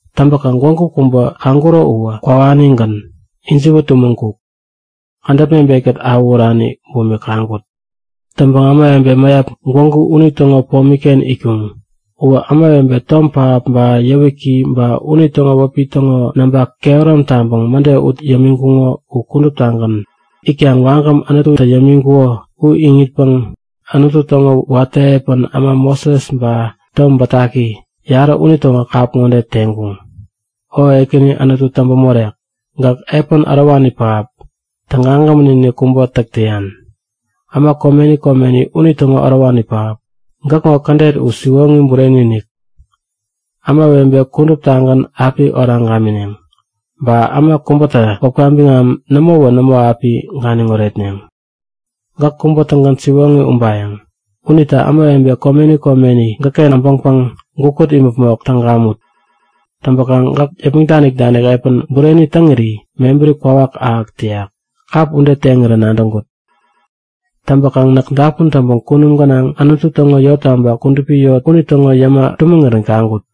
Täŋpäkaŋ gwägu kubä kaŋkuro uwä kwawanigän, ijiwä tumäŋ-kuk, kädäp mebet-kät awähurani bumik kaŋkut. Täŋpäŋ ämawebe mäyap gwägu unitäŋo pomi-ken itkuŋ. Uwä ämawebe tom pähap ba yäwiki ba unitäŋo wäpi täŋo namba kehärom taŋpäŋ mäde ut yämiŋkuŋo u kuduptagän. Itkaŋ wagäm, Anututä yämiŋkuko u iŋitpäŋ Anutu täŋo watä epän äma Moses ba Tom Bätaki, yarä unitäŋo kap ŋode teŋkuŋ; O Ekäni Anutu täŋpämorek, gäk epän ärowani pähap, tägagämän-inik kubä täk täyan. Äma komeni komeni unitäŋo Ärowani Pähap, gäkŋo kädet u siwoŋi bureni-inik. Ämawebe kuduptagän api oraŋ gamineŋ. Ba äma kubätä wäpka biŋam nämowä nämo api ganiŋ oretneŋ. Gäk kubä-tägän siwoŋi ubayäŋ. Unita ämawebe komeni komeni gäkken äbäŋpäŋ gukut imäpmok täŋ gamut! Täŋpäkaŋ gäk yäpmäŋ danik-danik epän bureni täŋiri mebäri kwawak ahäk täyak. Kap ude teŋirä nadäŋkut. Täŋpäkaŋ näk dapun täŋpäŋ kunum gänaŋ Anutu täŋo yottaba, kudupi yot unitäŋo yäma tumäŋirän kaŋkut.